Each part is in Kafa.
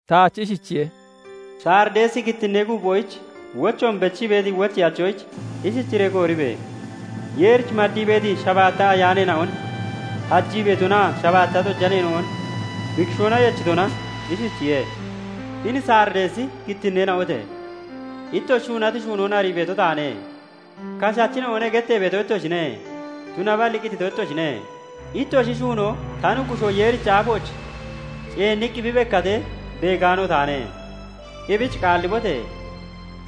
Taach ishichiye:- "Sarideesi kittinnee guuphoyich wochoon bechii beeti wocheyachoyich ishichiree kooribe! Yeerich maddii beeti shabaatta ayaaneena'on hajii beetonaa shabaatta xojaneena'on bi kishoona yechitona ishichiye:- Hini Sarideesi kittinneena'ote! Ittoshi shuunati shuunoon arii beeto taane; 'Kashachina'one' gettee beeto ittoshine; tunaballi qitito ittoshine. Ittoshi shuunoo ta Nuggushoo Yeerichi aafooch ceenniqqi bi bekkatee beegaano taane; ebich qaallibote!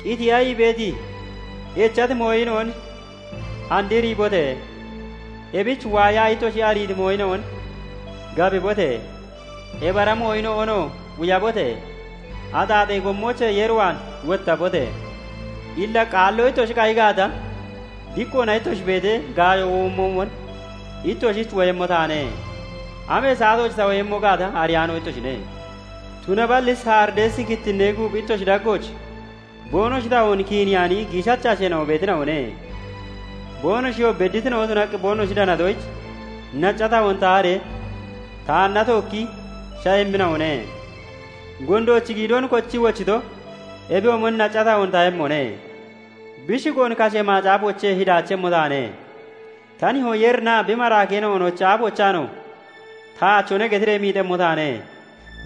Qitiya ii beeti, echati mooyina'on andriibote! Ebich waayaa ittoshi ariiti mooyina'on gabibote! Ebi ara mooyina'onoo quyabote! Axaaxee gommoochee Yeer waan wottabote! Illa qaalloo ittoshi qayi gaata, diqqoona ittoshi beetee gaayo womoomon, ittoshich woyemmo taane; amee saatooch ta woyemmo gaata ariyaano ittoshine; tunaballi Sarideesi kittinnee guuphi ittoshi daggooch boonoshi tahoon kiiniyaani giishacha asheena'o beetina'one; boonoshiyoo bedditina'o tunaqqi boonoshi danatoyich nacca tahoon taharee taanna tookki sha'emmina'one. Gondoochi giidoon kochii wochito ebiyoomon nacca tahoon tahemmone; bi shigoon kashee macaafoochee hidaachemmo taane; ta Nihoo Yeerinaa bi maraakeena'onochi aafoochaanoo 'Taachone' getiree miixemmo taane.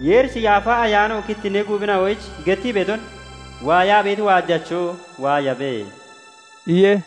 Yeerichi Yaafa Ayaano kittinnee guuphina'oyich gettii beeton waayaa beeti waajacho waayabe" iye.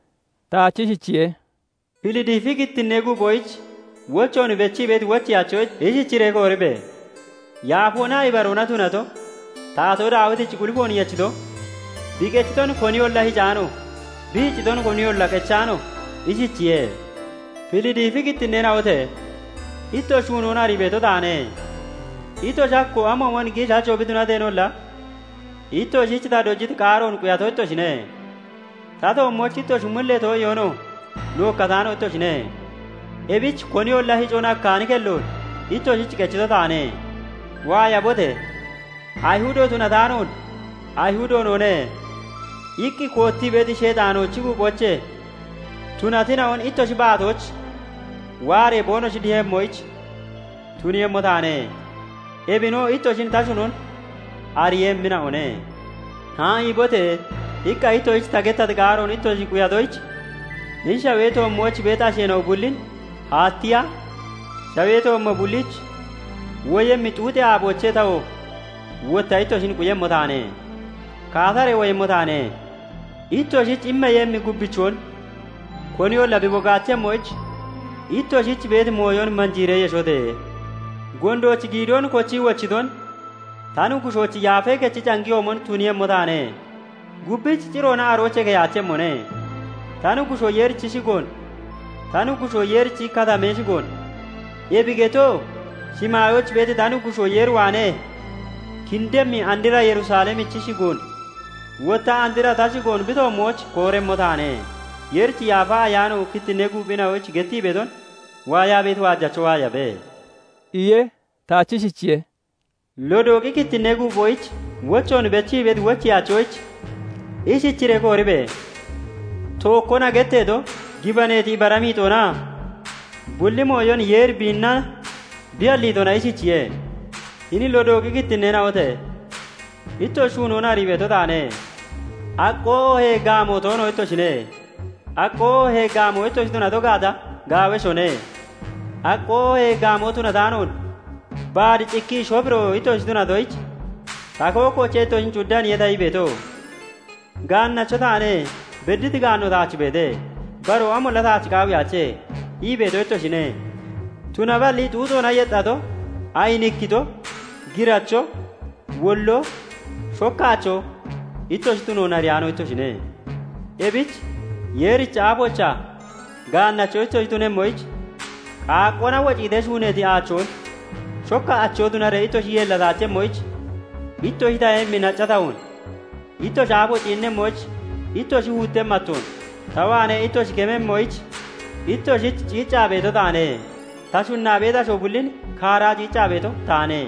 Taach ishichiye:- Filidiifi kittinnee guuphoyich wochoon bechii beeti wocheyachoyich ishichiree kooribe! Yaafoonaa Ibaroona tunato, Taatoo Daawitichi qulifoon yechito, bi qechiton koniyolla hicaano, bi hicciton koniyolla qechaano ishichiye:- Filidiifi kittinneena'ote! Ittoshi shuunoon arii beeto taane; ittoshi hakkoo amoomon giishacho bi tunateenolla, ittoshich ta dojiti qaaroon quyato ittoshine; ta toommooch ittoshi mullee too'iyoonoo nookkataano ittoshine; ebich koniyolla hicon hakkaani kelloon ittoshich qechito taane. Waayabote! Ayihudo tunataanoon, 'Ayihudo noone' iqqi koottii beeti, Sheexaanoochi guuphoochee tunatina'on ittoshi baatooch waaree boonoshi dihemmoyich tuniiyemmo taane; ebinoo ittoshin ta shunon ariiyemmina'one. 'Haa'iibote!' iqqa ittoshich ta gettati qaaroon ittoshi quyatoyich, hini shawee toommooch beeti asheena'o bullin haattiya, shawee toommo bulliich woyemmi xuuxee aaboochee tawoo wotta ittoshin quyemmo taane. Kaataree woyemmo taane; ittoshich immeeyemmi gubbichoon koniyolla bi bogaachemmoyich, ittoshich beeti mooyon manjiiree yeshote! Gondoochi giidoon kochii wochiton ta Nuggushoochi Yaafee Kechi cangiyoomon tuniiyemmo taane; gubbich ciroona aroochee keyaachemmone; ta Nuggushoo Yeerichi shigoon, ta Nuggushoo Yeerichi katamee shigoon, ebi getoo shimaayooch beeti ta Nuggushoo Yeer waanee kindemmi andra Yerusalemichi shigoon, wotta andra ta shigoon bi toommooch kooremmo taane. Yeerichi Yaafa Ayaano kittinnee guuphina'oyich gettii beeton waayaa beeti waajacho waayabe" iye. Taach ishichiye:- Lodooqi kittinnee guuphoyich wochoon bechii beeti wocheyachoyich ishichiree kooribe! Tookkona getteeto, gibaneeti ibara miixoonaa bulli mooyon Yeeri biinna bi halliitona ishichiye:- Hini Lodooqi kittinneena'ote! Ittoshi shuunoon arii beeto taane; aqqoo oohee gaamoo toono ittoshine; aqqoo oohee gaamoo ittoshi tunato gaata, gaaweshone. Aqqoo oohee gaamoo tunataanoon baad cikkii shofiro (shobiro) ittoshi tunatoyich, ta kookkoochee ittoshin cuddaniye ta ii beeto. 'Gaannacho taane; bedditi gaanno taach beete; baroo amolla taach qaawiyaache' ii beeto ittoshine; tunaballi xuuxoona yexxato, ayinikkito, giracho, wolloo, shokkaachoo ittoshi tunoon ariyaano ittoshine. Ebich Yeerichi aafoochaa gaannacho ittoshi tunemmoyich, qaaqqoona wociitee shuuneeti aachoon, shokka acho tunaree ittoshi yeellataachemmoyich ittoshi tahemmi nacca tahoon, ittoshi aafo ciinnemmoyich ittoshi huutemmi attoon ta waanee ittoshi kememmoyich ittoshich ciiccaa beeto taane. Ta shunna beeti asho bullin kaaraa ciiccaa beeto taane;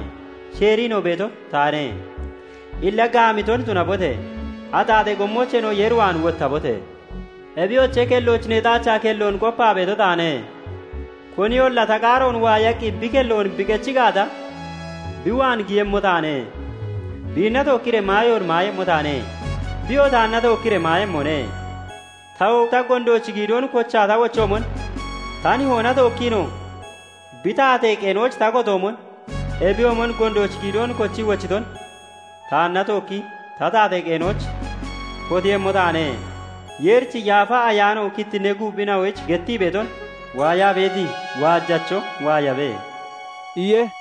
sheeriinoo beeto taane. Illa gaamiton tunabote! Axaaxee gommoocheenoo Yeer waan wottabote! Ebiyoche, kellooch neexaachaa kelloon qopaa beeto taane; koniyolla ta qaaroon waayaqqi bi kelloon bi qechi gaata, bi waan giyemmo taane; biinna tookkiree maayoon maayemmo taane; biyoo taanna tookkiree maayemmone. Ta wotta gondoochi giidoon kochaa ta wochoomon, ta Nihoona tookkiinoo bi taatee qeenooch ta kotoomon, ebiyoomon gondoochi giidoon kochii wochiton taanna tookki ta taatee qeenooch kotiiyemmo taane. Yeerichi Yaafa Ayaano kittinnee guuphina'oyich gettii beeton waayaa beeti waajacho waayabe" iye.